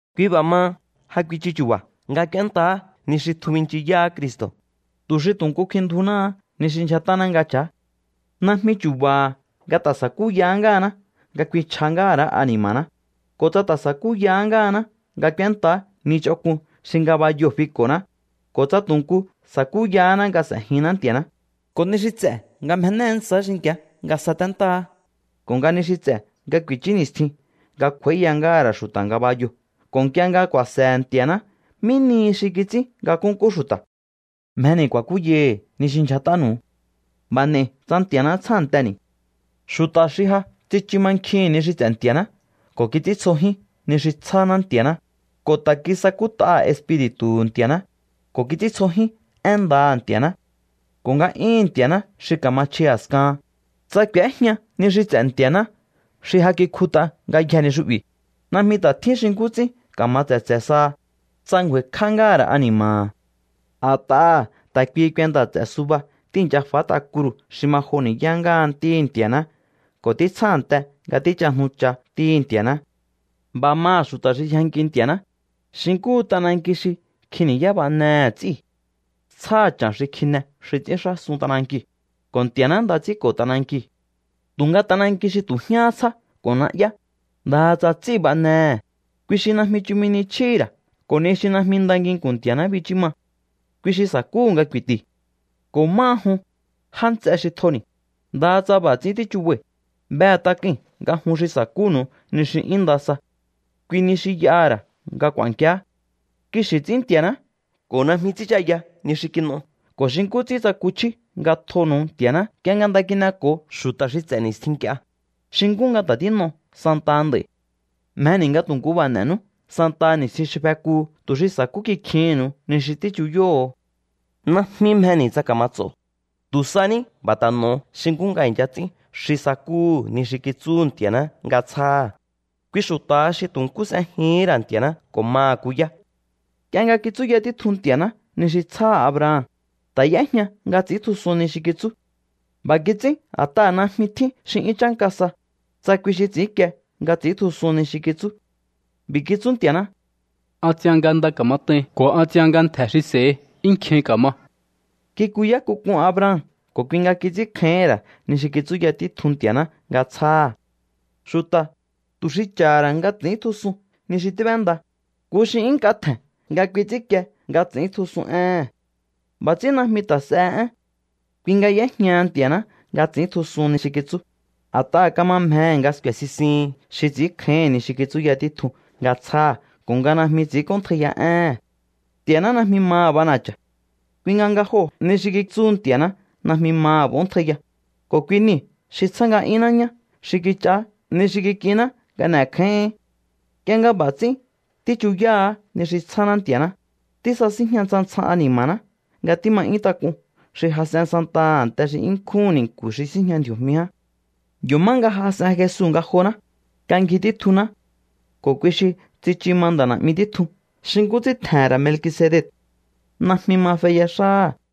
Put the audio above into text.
Kui b'a̱ maha, ja kuichu chu̱ba̱ nga k'úéntaá ni xi tjun binchiyáá Cristo̱, tu̱ xi tu̱ nku kfinndjunáá ni xi ndyjat'áná nga cha̱á. Najmi chu̱ba̱ha̱ nga ta̱ sa̱kúya ngáhaná nga kfinchj'a̱ ngáha̱ ra̱á ani̱ma̱ná, ko̱ tsa ta̱ sa̱kúya ngáhaná nga k'úéntaá ni ch'onk'un xi ngabayoo̱ fiko̱ná, ko̱ tsa tu̱ nku sa̱kúyaháná nga s'e̱jinná Nti̱a̱ná, ko̱ ni xi ts'e̱ nga mjenéé ntsa̱á xinki̱á nga saténtáá, ko̱ nga ni xi ts'e̱ nga ku̱i̱chú ni̱stjin nga kj'u̱a̱íya ngáha̱ ra̱ xu̱ta̱ ngabayoo̱ ko̱ nk'ie nga ku̱a̱se̱he̱ Nti̱a̱ná mí nihi xi kits'ín nga nkúnkú xu̱ta̱. Mjeni̱ ku̱a̱kúyai̱hi̱ ni xi ndyjat'ánu̱u. B'a̱ n'e̱i̱ tsa Nti̱a̱ná tsjánteni̱. Xu̱ta̱ xi ja tsichu mankjihi̱n ni xi ts'e̱ Nti̱a̱ná ko̱ kits'íntsjojín ni xi tsjáná Nti̱a̱ná, ko̱ ta̱ kisakút'aha̱ Espiri̱tu̱hu̱ Nti̱a̱ná, ko̱ kits'íntsjojín én ndaha̱ Nti̱a̱ná ko̱ nga'yúhu̱n Nti̱a̱ná xi ka̱ma chji a̱skahan, tsa k'u̱éjña ni xi ts'e̱ Nti̱a̱ná xi ja kikjut'a ngayjee̱ ni xu'bi̱, najmi ta̱ tjín xi nkú ts'ín ka̱ma tse̱tse̱ saha, tsa ngju̱a̱i̱kj'á ngáha̱ ra̱ ani̱ma̱ha̱. A̱t'aha̱ ta̱ kuihi kuenta̱ ts'e̱ suba tíi̱ncha fát'a kruu̱ xi ma jo ni̱yá ngáha Ntíhi̱ Nti̱a̱ná ko̱ títsjánte nga tíchajnucha Ntíhi̱ Nti̱a̱ná. B'a̱ maha̱ xu̱ta̱ xi yjanki Nti̱a̱ná, xi nkúhu t'ananki xi nkjin ni̱yá b'anehe̱ ts'í. Tsjáha̱ cha̱n xi kjine xi ts'ínxásun t'anankiu̱, ko̱ Nti̱a̱ná nda ts'ínko̱ t'anankiu̱. Tu̱nga t'ananki xi tu̱ jñáhá tsjá ko̱ na'yá, ndaha tsa ts'íu̱ b'anehe̱, kui xi najmi chumi ni chjíhi̱ ra̱ ko̱ ni xi najmi nda nginku̱n Nti̱a̱ná bichú ma. Kui xi sa̱kúhu̱ nga ku̱i̱ti̱. Ko̱ máha jun, já nts'e xi tjoni̱, ndaha tsa b'a̱ ts'ín tíchubai̱, behe̱ tak'ui̱n nga jun xi sa̱kúnu̱u ni xi 'yún nda sa. Kui ni xi y'aha̱ ra̱ nga k'u̱a̱nkiá. Kixi̱ ts'ín Nti̱a̱ná ko̱ najmi ts'ínchaya ni xi kin'o ko̱ xi nkú ts'ín tsakuchjíú nga tjonu̱u Nti̱a̱ná nk'ie nga nda kin'eko̱o xu̱ta̱ xi ts'e̱ ni̱stjin nk'ie, xi nkú nga ta̱ tín'o santaha nd'a̱i̱. Mjeni̱ nga tu̱ nkú b'a̱ n'e̱nú santaha ni̱stjin xi fekuu̱ tu̱ xi sa̱kú kikjihi̱nnu̱u ni xi tíchuyóho̱. Najmi mjeni̱ tsa ka̱ma ts'o. Tu̱ sa ní b'a̱ ta̱ n'o̱o xi nkú nga i̱ncha ts'ín xi sakúhu̱ ni xi kitsúhu̱ Nti̱a̱ná nga tsjáha̱. Kui xu̱ta̱ha xi tu̱ nkú s'ejihín ra̱ Nti̱a̱ná ko̱ maha̱ kuyá. Nk'ie nga kitsúya títjun Nti̱a̱ná ni xi tsjáha̱ Abraham, ta̱ y'éjña nga ts'i̱íntjusun ni xi kitsú. B'a̱ kits'ín a̱t'aha̱ najmi tjín xi 'yún chánka sa, tsa kui xi ts'i̱ínkie nga ts'i̱íntjusun ni xi kitsú. B'i̱ kitsú Nti̱a̱ná: “An ts'ian nga nda ka̱mat'ain ko̱ an ts'ian nga ntje̱ xi s'e̱hi 'yún nkjin ka̱ma.” Kikuyá k'uk'un Abraham ko̱ kui nga kits'ínkjáíhi̱n ra̱ ni xi kitsúya títjun Nti̱a̱ná nga tsjáha̱. Xu̱ta̱, tu̱ xi cha̱ha̱ ra̱ nga ts'i̱íntjusun ni xi tíb'enda, nku xi 'yún nk'a tje̱n nga kui ts'ínkie nga ts'i̱íntjusun éhe̱n. B'a̱ ts'ín najmi ta̱ s'ehe én. Kui nga y'éjñaha Nti̱a̱ná nga ts'i̱íntjusun ni xi kitsú, a̱t'aha̱ kama mjehe̱ nga sku̱e̱ sisihin xi ts'i̱ínkjáíhi̱n ni xi kitsúya títjun nga tsjáha̱ ko̱ nga najmi ts'ínk'óntjaiya éhe̱n. Nti̱a̱ná najmi maha̱ b'ana̱cha̱. Kui nga nga joo̱ ni xi kitsúhu Nti̱a̱ná najmi maha̱ b'óntjaiyaha, ko̱ kui niu̱ xi tsjá nga'yúnná ñá xi kich'aá ni xi kik'inná nga n'e̱kjáíhi̱ín. Nk'ie nga b'a̱ ts'ín tíchuyáha̱á ni xi tsjáná Nti̱a̱ná, tísasíjña ntsjan ntsjan ani̱ma̱ná nga tíma 'yún tak'un xi jas'en santaha a̱nte xi 'yún nkjúhu̱n ni̱nku̱ xi síjña ndji̱o̱jmi ján. Yo̱ má nga jas'en Jesu ngajoná, nga ngji títjunná. Ko̱ kui xi tsichu ma nda̱ na̱'mi títjun xi nkú ts'ín tje̱he̱n ra̱ Melkisedec. Najmi ma feya xáha̱.